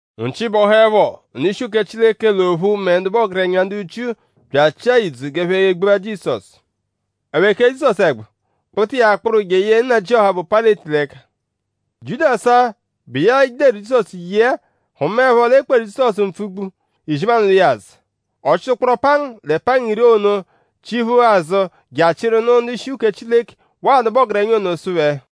Nchi bọhuepho; ndu-ishi uke Chileke l'ophu mẹ ndu bụ ọgerenya ndu Jiu bya achịa idzu g'ẹphe gbua Jizọsu. Ẹphe kee Jizọsu ẹgbu; kpụta iya kpụru jeye nnajịoha, bụ Payịleti l'ẹka. Jiudasu-a, bụ iya deru Jizọsu ye-a hụmaepho l'e kperu Jizọsu mpfugbu; izimanụ lwa iya azụ. Ọ chịta ụkporo pangu lẹ pangu iri ono chiphu azụ je achịru nụ ndu-ishi uke Chileke waa ndu bụ ọgerenya ono sụ phẹ: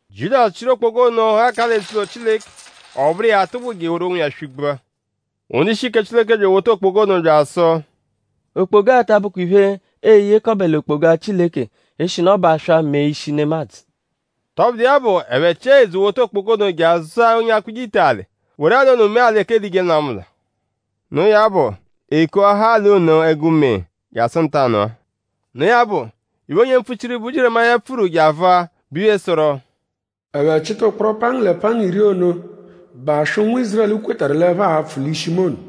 Jiudasu chịru okpoga ono ghakaa l'eze-ụlo Chileke; ọ bụru iya atụgbu je eworu onwiya swị-gbua. Ndu-ishi uke Chileke bya ewota okpoga ono bya asụ: “Okpoga-a ta abụkwa iphe, ee-yekọbe l'okpoga Chileke eshinu ọ bụ aswa mee ishi nemadzụ.” Tọbudu iya bụ; ẹphe chịa ìdzù wota okpoga ono je azụa onye akpụje ite alị; woru alị ono mee alị ẹka ee-lije nlwamụlwa. Noo ya bụ; e kuahaa alị ono ẹgu-mee jasụ ntanụ-a. Noo ya bụ; iphe, onye mpfuchiru, bụ Jieremaya pfuru je avụa, bụ iphe, sụru: “Ẹphe chịta ụkporo pangu lẹ pangu iri ono, bụ aswa, ụnwu Ízurẹlu kwetarụ l'ẹphe a-pfụ l'ishi mu ono;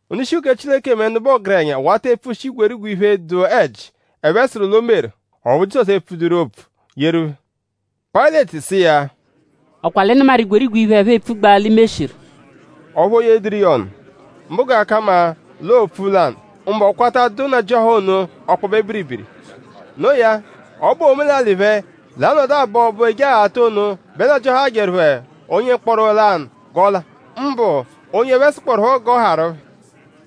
Ndu-ishi uke Chileke mẹ ndu bụ ọgerenya wata epfushi igwerigwe iphe, dụ ẹji, ẹphe sụru l'o meru; ọphu Jizọsu epfuduru opfu yeru phẹ. Payịleti sụ iya: “?Ọ kwa l'ị nụmaru igwerigwe iphe, ẹphe epfugbaa l'i meshiru?” Ọphu o yedụru iya ọnu; mbụ g'ọ ka mma l'ọo olu-opfu lanụ; mbụ ọ kwata dụ nnajịoha ono ọkpobe biribiri. Noo ya; ọ bụwaa omelalị phẹ l'anọdu abọ Ọbo Ojeghata ono bẹ nnajịoha ahajẹru phẹ onye mkpọro lanụ g'ọ la; mbụ onye ẹphe sụkpoerupho g'ọ haarụ phẹ.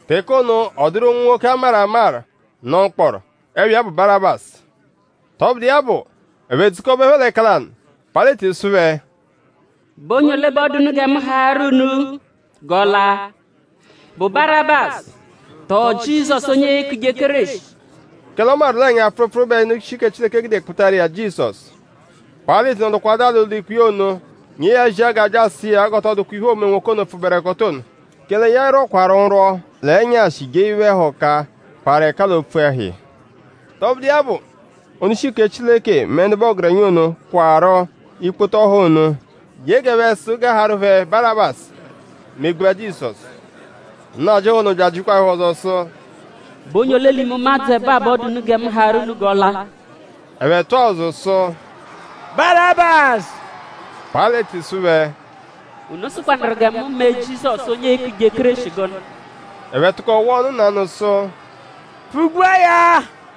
Teke ono; ọ dụru nwoke, a maru amaru, nọ mkpọro; ẹpha iya bụ Barabasu. Tọbudu iya bụ; ẹphe dzukọbeepho l'ẹka lanụ; Payịleti sụ phẹ: “?Bụ onye ole bẹ ọ dụ unu gẹ mu haarụ unu g'ọ la??Bụ Barabasu; tọo Jizọsu onye eekuje Kéreshi?” Kẹle ọ mawaru l'ọo ẹnya-pfụrupfuru bẹ ndu-ishi uke Chileke gude kpụtaru iya Jizọsu. Payịleti nọdukwadua l'ụlo-ikpe ono; nyee ya zia g'a bya asụ iya g'ọ tọ dụkwa iphe, oo-me nwoke ono, pfụberekoto ono; kẹle ya rwọkwaru nrwọ l'ẹnyashi jee iphe-ẹhuka, parụ ẹka l'opfu ẹhu iya. Tọbudu iya bụ; ndu-ishi uke Chileke mẹ ndu bụ ọgerenya ono kwarụ ikpoto ndu ono ye g'ẹphe sụ g'a haarụ phẹ Barabasu; megbua Jizọsu. Nnajịoha ono bya ajịkwa phẹ ọzo sụ: “?Bụ onye ole l'ime ụmadzu ẹbo-a bẹ ọ dụ unu gẹ mu haarụ unu g'ọ la?” Ẹphe tụa ụzu sụ: “Barabasu.” Payịleti sụ phẹ: “?Unu sụkwanuru gẹ mu me Jizọsu; onye eeku Kéreshi gụnu?” Ẹphe tụko wụa ọnu nanụ sụ: “Pfụ-gbua ya!”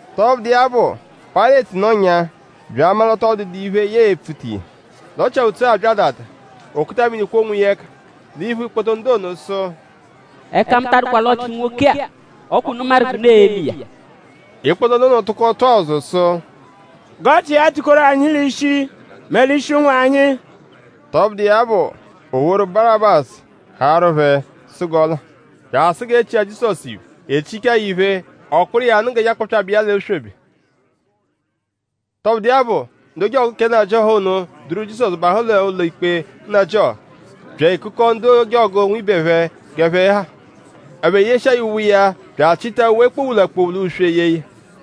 Tọbudu iya bụ; Payịleti nọnyaa; bya amaru l'ọ tọ dụdu iphe, ya epfuta iya; l'ọ chia ùtsú abya adada; o kuta mini kwọo onwiya ẹka l'iphu ikpoto ndu ono sụ: “Ẹka mu ta adụkwa l'ọchi nwoke-a. Ọ kwa unu maru g'unu e-me iya.” Ikpoto ndu ono tụko tụa ụzu sụ: “G'ọchi iya tukoru anyi l'ishi mẹ l'ishi ụnwu anyi.” Tọbudu iya bụ; o woru Barabasu haarụ phẹ sụ g'ọ la; bya asụ g'e chia Jizọsu iphe. E chichaa ya iphe; ọ kpụru iya nụ g'e je akpọpyabe iya l'oswebe. Tọbudu iya bụ; ndu ojọgu kẹ nnajịoha ono duru Jizọsu bahụ l'ụlo-ikpe nnajịoha; bya ekukọo ndu ojọgu nwibe phẹ g'ẹphe ha. Ẹphe yeshia ya uwe iya bya achịta uwe kpowula-kpowula uswe yee ya.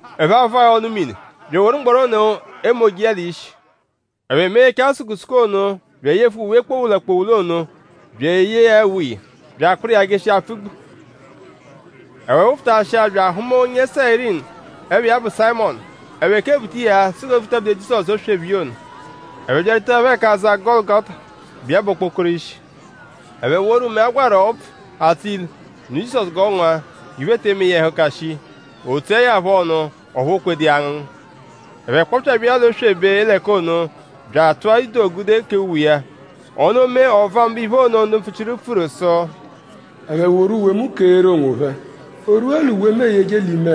Ẹphe avụa ya ọnu-mini; bya eworu mgbọro ono emoje iya l'ishi. Ẹphe meghechaa ya sukusuku ono; bya eyefu iya kpowula-kpowula uwe ono; bya eyee ya uwe iya; bya akpụru iya jeshia apfugbu. Ẹphe wụfutashia bya ahụma onye Sayirini, ẹpha iya bụ Sayịmonu. Ẹphe kebuta iya sụ g'o vutabude Jizọsu oswebe iya ono. Ẹphe byarwutaẹpho ẹka aza Gọlugota, bụ iya bụ okpokoro ishi; ẹphe woru mẹe, a gwarụ ọbvu, atsọ ilu; nụ Jizọsu g'ọ ngụa; g'iphe te eme iya ẹhuka shii. O tsuẹ ya phọ ọnu; ọphu o kweẹdu iya angụngu. Ẹphe kpọpyabe iya l'oswebe l'ẹka ono bya atụa ido gude kee uwe iya. Ono mee ọ vụa mbụ iphe ono, ndu mpfuchiru pfuru sụ: “Ẹphe woru uwe mu keeru onwophẹ. O rwua l'uwe mu eyeje l'ime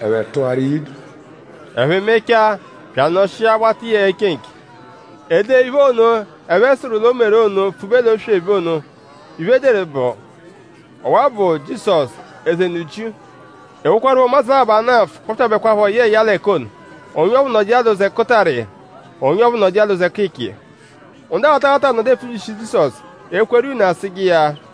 ẹhu ẹphe tụaru iya ido.” Ẹphe mechaa; bya anọshia wata iya eche nche. E dee iphe ono, ẹphe sụru l'o meru ono pfube l'oswebe ono. Iphe, e deru bụ: “Ọwa-a bụ Jizọsu; Eze ndu Jiu.” E wokwarụpho ụmadzu labọ, ana nfụ; kpọpyabekwapho yẹe ya l'ẹka ono; onye ọphuu nọdu l'ụzo ẹkutara iya; onye ọphuu nọdu l'ụzo ẹkicha iya. Ndu aghata aghata nọdu epfubyishi Jizọsu; ekweru iya une asụje iya: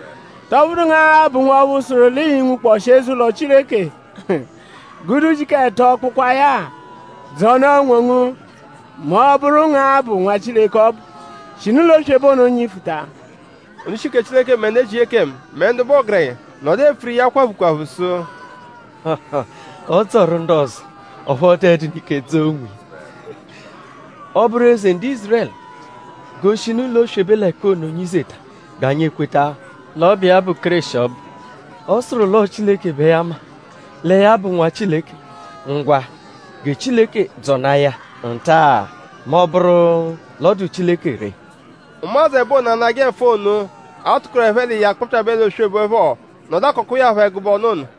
“?Tọ bụnu ngu-a bụ nwọphu sụru l'ii-nwukpọshi eze-ụlo Chileke gude ujiku ẹto kpụkwaa ya-a? Dzọnaa onwongu mẹ ọ -bụru ngu-a bụ Nwa Chileke ọbu. Shinu l'oswebe ono nyifuta!” Ndu-ishi uke Chileke mẹ ndu ezije ekemu mẹ ndu bụ ọgerenya nọdu epfuru iya kwaphu kwaphu sụ: “Ọ dzọru ndu ọzo; ọphu ọ dụedunu ike dzọo onwiya. Ọ -bụru eze ndu Ízurẹlu; g'o shinu l'oswebe l'ẹka ono nyizeta g'anyi ekweta l'ọ bụ iya bụ Kéreshi ọbu. Ọ sụru l'ọo Chileke bẹ ya ma; lẹ ya bụ Nwa Chileke; ngwa; gẹ Chileke dzọnaa ya nta-a mẹ ọ -bụru l'ọ dụ Chileke ree.” Ụmadzu ẹbo ono, anajẹ nfụ ono, a tụkoru ẹphe l'iya kpọpyabe l'oswebe phọ nọdu akọkwa iya phọ ẹgube ọnu ono.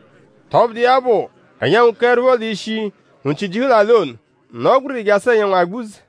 Tọbudu iya bụ; ẹnyanwu keẹrupho l'ishi; nchi jihu l'alị ono; nọo gbiriri jasụ l'ẹnyanwu agbuze.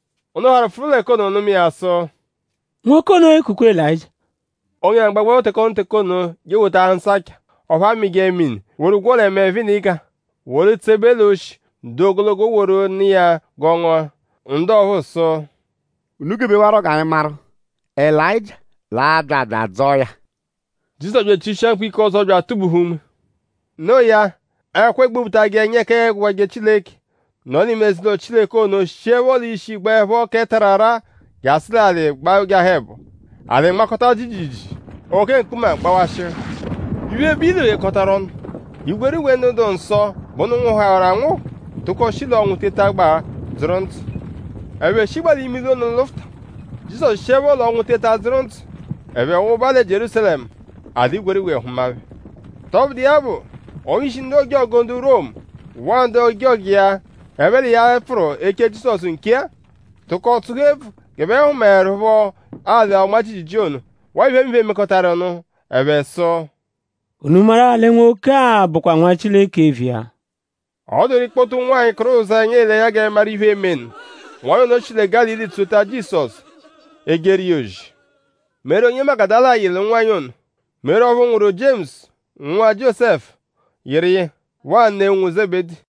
Ndu harụ pfụru l'ẹka ono nụma iya sụ: “Nwoke ono ekukwa Elayịjia.” Onye lanụ gbagbụepho teke ono teke ono je ewota asancha ọphu amịje mini woru gwọo lẹ mẹe-venịga, woru tsebe l'oshi, dụ ogologo woru nụ iya g'ọ ngụa. Ndu ọphuu sụ: “Unu gebewarọ g'anyi maru?Elayịjia l'a-bya bya adzọo ya?” Jizọsu bya echishia mkpu ike ọzo bya atubuhu unme. Noo ya; ẹkwa egbobutajẹ ẹnya ẹka aagwajẹ Chileke, nọ l'ime eze-ụlo Chileke ono shiẹpho l'ishi gbaẹpho kẹ tararaa jasụ l'alị gbajahụ ẹbo. Alị nmakọta jiijiijii; oke mkpuma gbawashịhu. Iphe, bụ ilu ghekọtaru ọnu. Igwerigwe ndu dụ nsọ, bụ ndu nwụhuhawaru anwụhu tụko shi l'ọnwu tetagbaa dzụru ndzụ. Ẹphe shigbaa l'ime ilu ono lụfuta. Jizọsu shiẹpho l'ọnwu teta dzụru ndzụ; ẹphe wụba lẹ Jierúsalẹmu. A dụ igwerigwe hụma phẹ. Tọbudu iya bụ; onye-ishi ndu ojọgu ndu Romu waa ndu ojọgu iya, ẹphe l'iya pfụru eche Jizọsu nche-a; tụko tsụhu ebvu g'ẹphe hụmaeru phọ alị-ọnma-jiijiijii ono waa iphemiphe, mekọtaru nụ. Ẹphe sụ: “?Unu maru-a lẹ nwoke-a bụkwa Nwa Chileke eviya.” Ọ dụru ikpoto ụnwanyi, kụru ụzenya ele ẹnya g'ẹphe maru iphe, eme nụ. Ụnwanyi ono shi lẹ Gálili tsota Jizọsu; ejeru iya ozi. Meri onye Magudala yị l'ụnwanyi ono. Meri ọphu nwụru Jiemusu; nwụa Jiósẹfu yịru iya; waa ne ụnwu Zebedi.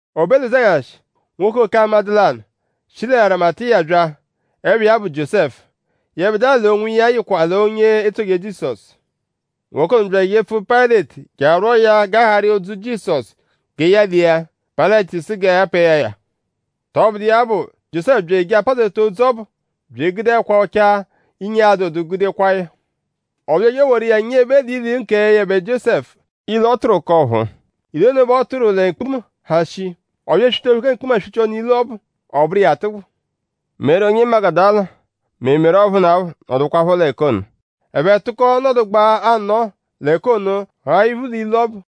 O be l'ụzenyashi; nwoke oke amadụ lanụ, shi lẹ Arimatiya bya; ẹpha iya bụ Jiósẹfu. Yẹbedua l'onwiya yịkwa l'onye etsoje Jizọsu. Nwoke ono bya ejepfu Payịleti je arwọo ya g'a haarụ iya odzu Jizọsu gẹ ya lia. Payịleti sụ g'a pẹe ya ya. Tọbudu iya bụ; Jiósẹfu bya eje apazeta odzu ọbu bya egude ẹkwa ọchaa, inyi adụdu gude kwaa ya. Ọ bya eje eworu iya nyebe l'ilu kẹ yẹbe Jiósẹfu; ilu, ọ tụru k'ọ̀phúú. Ilu ono bẹ ọ tụru lẹ mkpuma, ha shii. Ọ bya eswita oke mkpuma swichia ọnu ilu ọbu; ọ bụru iya atụgbu. Meri onye Magudala mẹ Meri ọphunapho nọdukwapho l'ẹka ono. Ẹphe tụko nọdugbaa anọo l'ẹka ono gha iphu l'ilu ọbu.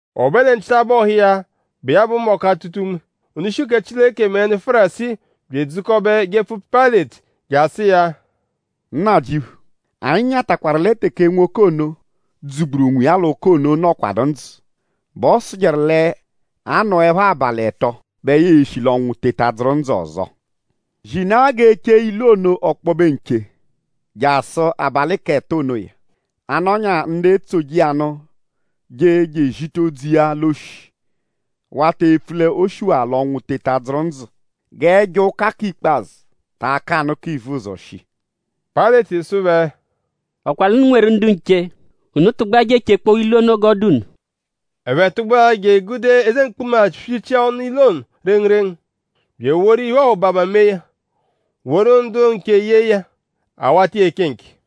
O be lẹ nchitabọhu iya, bụ iya bụ mbọku atụta unme; ndu-ishi uke Chileke mẹ ndu Fárisii bya edzukọbe jepfu Payịleti je asụ iya: “Nnajịuphu; anyi nyatakwarụ lẹ teke nwoke ono, dzụ-gburu onwiya l'ụka ono nọkwadu ndzụ bẹ ọ sụjeru l'a -nọepho abalị ẹto bẹ ya e-shi l'ọnwu teta dzụru ndzụ ọzo. Zinaa g'e chee ilu ono ọkpobe nche jasụ abalị k'ẹto onoya; a -nọnyaa ndu etsoje iya nụ je je ezita odzu iya l'oshi wata epfu l'o shiwaa l'ọnwu teta dzụru ndzụ. G'ẹjo ụka k'ikpazụ ta akanụ k'ivuzọ shii.” Payịleti sụ phẹ: “?Ọ kwa l'unu nweru ndu nche? Unu tụgbua je echekpọo ilu ono g'ọ dụ unu.” Ẹphe tụgbua je egude eze mkpuma swichia ọnu ilu ono rengurengu; bya eworu iphe-ọhubama mee ya; woru ndu nche ye iya; a wata iya eche nche.